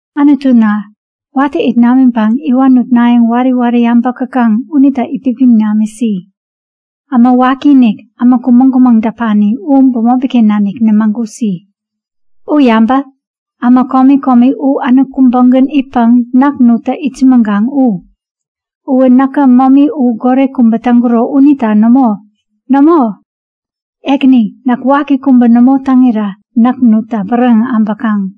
Anutuna, watä it namiŋpäŋ iwan nutnayäŋ wari wari äbäk täkaŋ unita itpipiŋ namisi. Äma wakiinik, äma kumäŋ-kumäŋ däpani u bämopiken nanik nämagusi! U yabä! Äma komi komi u änok kubägän itpäŋ näk nutta itsämäŋkaŋ u. Uwä näkä momi ba goret kubä täŋkuro unita nämo. Nämo! Ekäni, näk waki kubä nämo täŋira näk nutta bäräŋeŋ äbäkaŋ.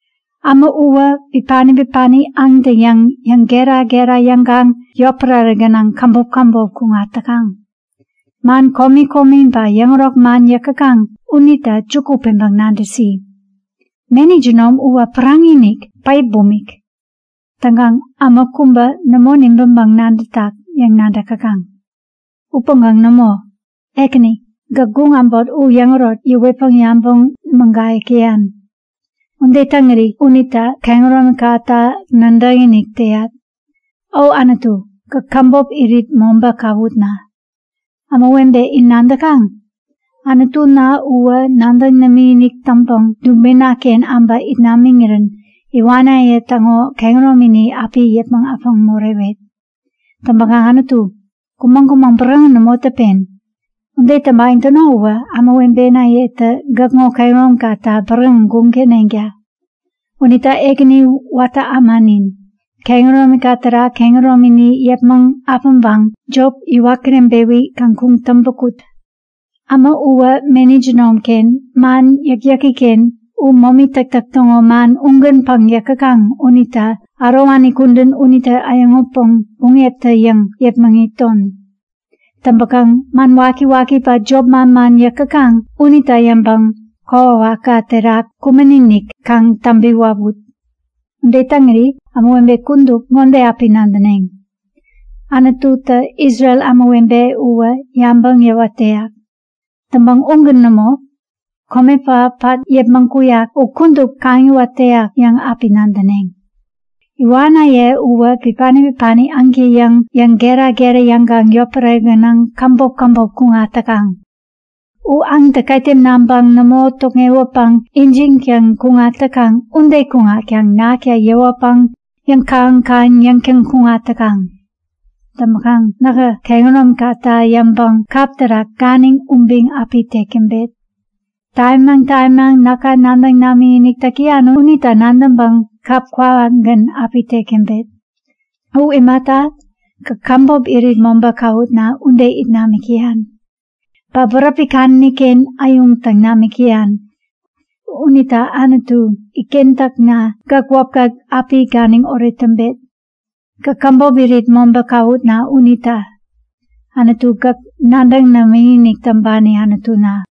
Äma uwä bipani bipani aŋtä-yäŋ yäŋgera-gera yäŋkaŋ yotpärare gänaŋ käbop käbop kuŋat täkaŋ. Man komi komi ba yäŋärok man yäk täkaŋ unita juku peŋpäŋ nadäsi. Meni jinom uwä päraŋi-inik, päip bumik. Täŋkaŋ äma kubä nämo nibäŋpäŋ nadätak yäŋ nadäk täkaŋ. Upäŋkaŋ nämo! Ekäni gäk guŋ äbot u yäŋärok yäwetpäŋ yabäŋ mägayäk täyan. Ude täŋiri unita kehäromikata nadäkinik täyat. O Anutu, gäk käbop irit mobä käwutna. Ämawebe, in nadäkaŋ? Anutuna uwä nadäŋ namikinik täŋpäŋ dubinaken äbä it namiŋirän iwanaye täŋo kehäromini api yäpmäŋ äpäŋ morewet. Täŋpäkaŋ Anutu, kumäŋ-kumäŋ bäräŋeŋ nämo däpen. Ude täŋpayäŋ täno uwä ämawebenayetä gäkŋo kehäromikata bäräŋeŋ guŋ täneŋta. Unita Ekäni watä ämanin, kehäromika terak kehäromini yäpmäŋ äpäŋpäŋ jop yäwat kireŋpewi kaŋ kuŋtäŋpä kut. Äma uwä meni jinomken, man yäkyäkiken u momi täktäk täŋo man ugänpäŋ yäk täkaŋ unita ärowani kudän unitä äyäŋutpäŋ buŋeptä-yäŋ yepmäŋiton. Täŋpäkaŋ man wakiwaki ba jop manman yäk täkaŋ unita yäŋpäŋ kokwawakka terak kumän-inik kaŋ täŋpi wawut. Ude täŋiri ämawebe kudup ŋode api nadäneŋ; Anututä Isrel ämawebe uwä yabäŋ yäwat täyak. Täŋpäŋ ugän nämo. Kome pähap pat yäpmäŋ kuyak u kudup kaŋiwat täyak yäŋ api nadäneŋ. Iwanaye uwä bipani bipani aŋtä-yäŋ yäŋgera-gera yäŋkaŋ yotpärare gänaŋ käbop käbop kuŋat täkaŋ. U aŋtä ketem naŋpäŋ nämo tokŋewäpäŋ ijiŋtäŋ kuŋat täkaŋ ude kuŋatkaŋ nakta yewäpäŋ yäŋkähän-kähän yäŋtäŋ kuŋat täkaŋ. Täŋpäkaŋ nähä kehäromikata yäŋpäŋ kap terak ganiŋ ubiŋ api tek täŋpet. Tamimaŋ tamimaŋ näka nadäŋ namikinik täk täyan unita nadäŋpäŋ kap kwawakgän api tek täŋpet. U imata, gäk käbop irit mobä käwutna ude it namik täyan. Ba bäräpi kadäniken äyuŋ täŋ namik täyan. Unita Anutu itkentäkna, gäk wäpka api ganiŋoret täŋpet. Gäk käbop irit mobä käwutna unita. Anutu, gäk nadäŋ namikinik täŋpani Anutuna.